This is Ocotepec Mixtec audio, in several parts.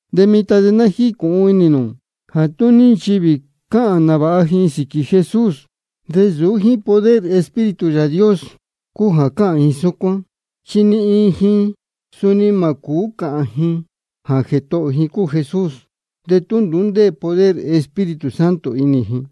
De mitan de ná jícūhun inī nū jā tú ní nchivī cáhān nāvāha ji sīquī Jesús, de nsūú jíín poder Espíritu Yāā Dios cúu jā cáhān ji súcuán. De ni iin ji suni mā cūú cāhān ji jā Jētohō ji cúu Jesús, de tú nduú ndéē poder Espíritu Santo inī ji.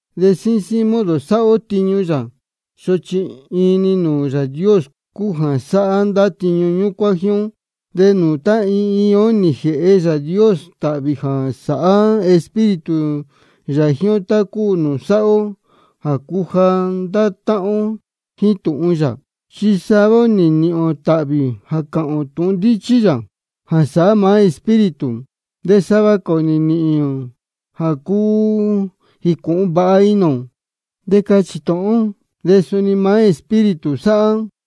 De síín síín modo sáhá ó tiñu yā, sochi iin-ni Yāā Dios cúu jā sáhá ndá tiñu ñúcuán jíín ó. De nūū tá iin iin ó nī jēhe Yāā Dios tāhvī jā sáhá Espíritu yā jíín ó, tácua ná sáhá ó jā cuja ndá táhán ó jíín tūhun yā. Chi sava ó nī nīhīn ō tāhvī jā cáhān ndīchí ó tūhun yā, jā sáhá maá Espíritu. De sava cā ō nī nīhīn ō jā cúu jícūhun vāha inī ō de cáchī tūhun ó, de suni maá Espíritu sáhá.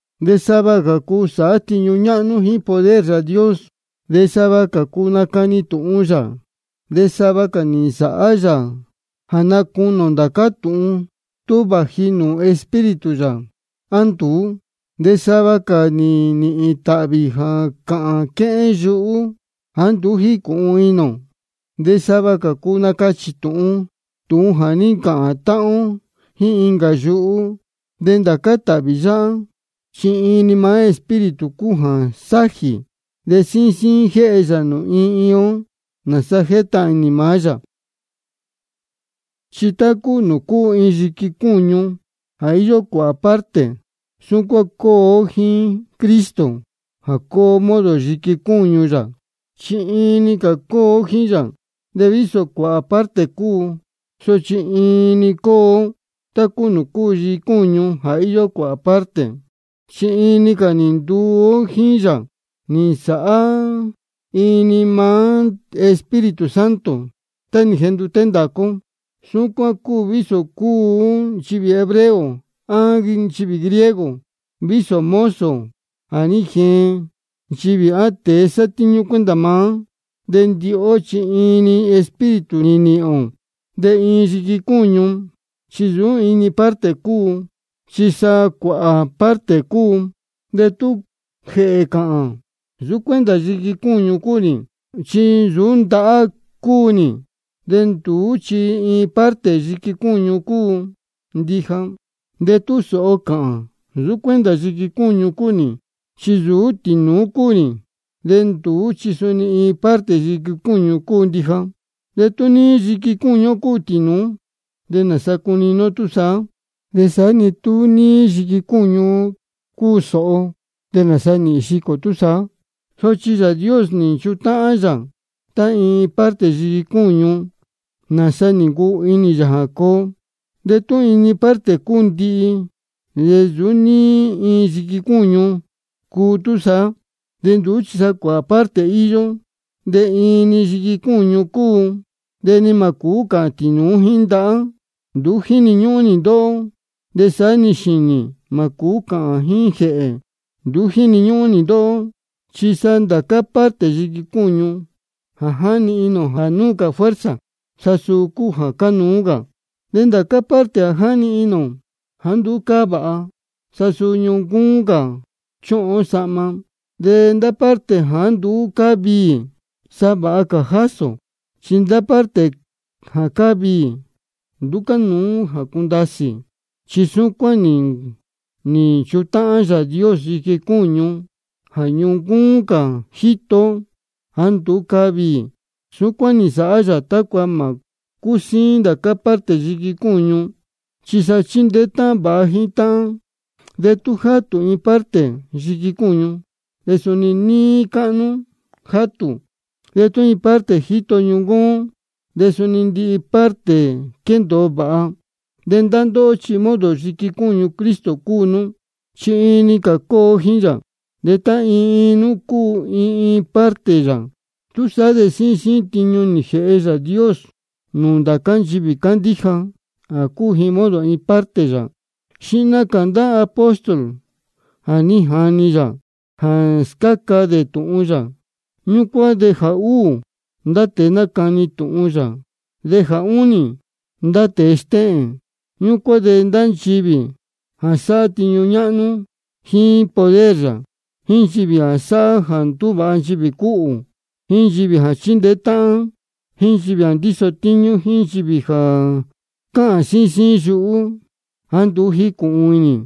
De sava cā ō cúu sáhá tiñu ñáhnú jíín poder Yāā Dios. De sava cā ō cúu nácani tūhun yā. De sava cā ō nī nsāhá yā jā nácunī ō ndācá tūhun, tú vāji nūū Espíritu yā á nduú. De sava cā ō nī nīhīn tāhvī jā cáhān ō quéhén yuhú jāá nduú jícūhun inī ō. De sava cā ō cúu nácachī tūhun ó tūhun jā ní ncāhān táhán ó jíín incā yuhú. De ndācá tāhvī yáhá, chi iin-ni maá Espíritu cúu jā sájī, de síín síín jéhe yā nūū iin iin ó, nāsa jétahān inī maá yā. Chi tá cúu nūū cúu iin yiqui cúñu jā íyó cuāhā parte, súcuán cúu ó jíín Cristo jā cúu ó modo yiqui cúñu yā, chi iin-ni cā cúu ó jíín yā. De vísō cuāhā parte cúu ó, sochi iin-ni cúu ó, tá cúu iin yiqui cúñu jā íyó cuāhā parte. Chi iin-ni cā nī nduu ó jíín yā nī nsāhá iin-ni maá Espíritu Santo tá nī jenduté ndācá ó. Súcuán cúu vísō cúu ó nchivī hebreo á nchivī griego, vísō mozo jā ní jeen nchivī á tēe sátíñú cuenta maá. De ndihi ó chi iin-ni Espíritu nī nīhīn ō. De iin yiqui cúñu chi nsūú iin-ni parte cúu, chi sa cuāhā parte cúu. De tú jēhē cāhān: Nsūú cuenta yiqui cúñu cúu nī, chi nsūú ndahá cúu nī, de nduú chi iin parte yiqui cúñu cúu ndija. De tú sōho cāhān: Nsūú cuenta yiqui cúñu cúu nī, chi nsūú tīnūú cúu nī, de nduú chi suni iin parte yiqui cúñu cúu ndija. De tú níí yiqui cúñu ó cúu tīnūú, ¿de nāsa cunini ó túsaá? De saá-ni tú níí yiqui cúñu ó cúu sōho, ¿de nāsa nīhīn xicō ō túsaá? Sochi Yāā Dios nī nchutáhán yā tá iin iin parte yiqui cúñu, nāsa nī ncuu inī yā jā coo. Chi tú iin-ni parte cúu ndihi, de nsūú níí iin yiqui cúñu cúu túsaá. De nduú chi cuāhā parte íyó, de iin-ni yiqui cúñu cúu. De ni mā cūú cāhān tīnūú jíín ndahá: Nduú jíni ñúhún nī ndóhó. De saá-ni xīnī, mā cūú cāhān jíín jēhē: Nduú jíni ñúhún nī ndóhó. Chi sa ndācá parte yiqui cúñu jā jáni inī ō jā núu cā fuerza, sa suu cúu jā cánuú cā. De ndācá parte jā jáni inī ō jāá nduú cáá vāha, sa suu ñuncúún cā chúhun ó sahma. De ndá parte jāá nduú cáá viī, sa vāha cā jásī ō. Chi ndá parte jā cáá viī, nduú cánuú jā cundasī. Chi súcuán nī nchutáhán Yāā Dios yiqui cúñu, jā ñuncúún cā jíto ó jāá nduú cáá viī. Súcuán nī nsāhá yā tácua mā cúsíín ndācá parte yiqui cúñu, chi sa chindeé táhán vāha jíín táhán. De tú játū iin parte yiqui cúñu, de suni níí cáhnú játū. De tú iin parte jíto ñuncúún ó, de suni ndihi-ni parte quéndōo vāha. De ndá ndóhó chi modo yiqui cúñu Cristo cúu nú, chi iin-ni cā cúu ó jíín yā. De tá iin iin nú cúu iin iin parte yā. Túsaá de síín síín tiñu nī jēhe Yāā Dios nūū ndācá nchivī cándíja jā cúu ji modo iin iin parte yā: Xihna cā ndācá apóstol jā ní jani yā jā scáca dē tūhun yā. Ñúcuán de jā úū, ndá tēe nácani tūhun yā, de jā únī, ndá tēe stéhēn. Ñúcuán de ndá nchivī jā sáhá tiñu ñáhnú jíín poder yā, jíín nchivī jā sáhá jā ndúvāha nchivī cúhū, jíín nchivī jā chíndeé táhán, jíín jā ndíso tíñú, jíín nchivī jā cáhān síín síín yuhú jāá nduú jícūhun inī.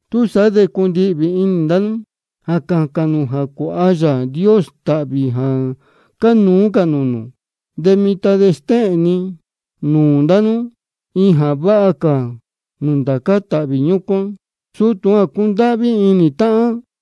Túsaá de cundihvī inī ndá nú jā cācān nū jā cuāha Yāā Dios tāhvī jā cánuú cā nūū nū. De mitan de ná stéhēn ni nūū ndá nú iin jā váha cā nūū ndācá cā tāhvī ñúcuán, suu tūhun cúndáhví inī táhán.